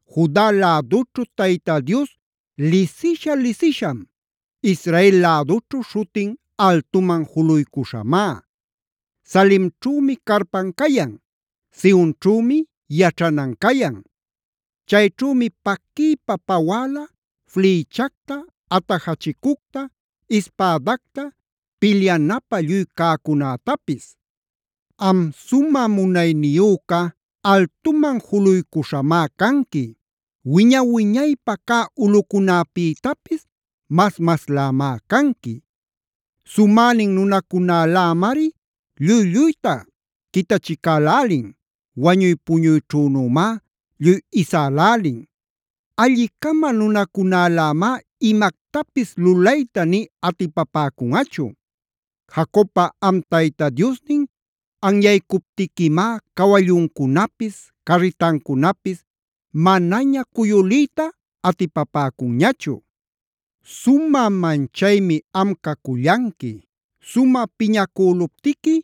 Juda lädućhu Tayta Dios lisisha-lisisham. Israel lädućhu śhutin altuman juluycuśhamá. Salemćhümi carpan cayan. Sionćhümi yaćhanan cayan. Chayćhümi paquiypa pawäla flïchacta, atajachicucta, ispädacta, pilyanapä lluy cäcunätapis. Am sumä munayniyüca altuman juluycuśhamá canqui. Wiña-wiñaypä cä ulꞌucunäpïtapis mas-maslämá canqui. Sumänin nunacunälämari lluy-lluyta quitachicälälin. Wañuy puñuyćhünümá lluy isälälin. Alli-cama nunacunälämá imactapis lulayta nï atipapäcunꞌachu. Jacobpa am Tayta Diosnin anyaycuptiquimá cawalluncunapis, carritancunapis manaña cuyuliyta atipapäcunñachu. ¡Sumä manchaymi am cacullanqui! Sumä piñacüluptiqui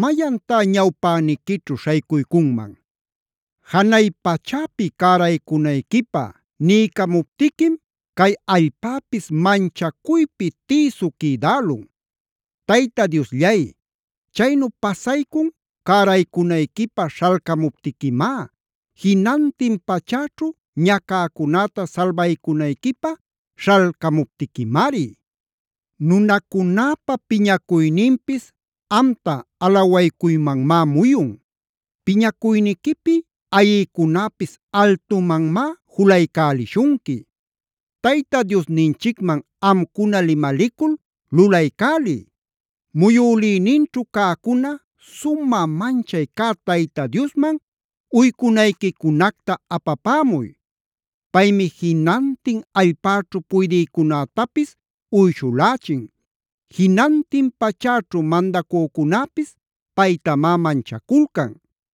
¿mayantá ñawpäniquićhu śhaycuycunman? Janay pachäpi cäraycunayquipä niycamuptiquim, cay allpäpis manchacuypi tïsu quïdälun. Tayta Diosllay, chaynu pasaycun cäraycunayquipä śhalcamuptiquimá, jinantin pachäćhu ñacäcunäta salbaycunayquipä śhalcamuptiquimari. Nunacunäpa piñacuyninpis amta alawaycuymanmá muyun. Piñacuyniquipi ayïcunäpis altumanmá julaycälishunqui. Tayta Diosninchicman amcuna limalicul lulaycäliy. Muyülïninćhu cäcuna sumä manchay cä Tayta Diosman uycunayquicunacta apapämuy. Paymi jinantin allpäćhu puydïcunätapis uyshulächin. Jinantin pachäćhu mandacücunäpis paytamá manchaculcan.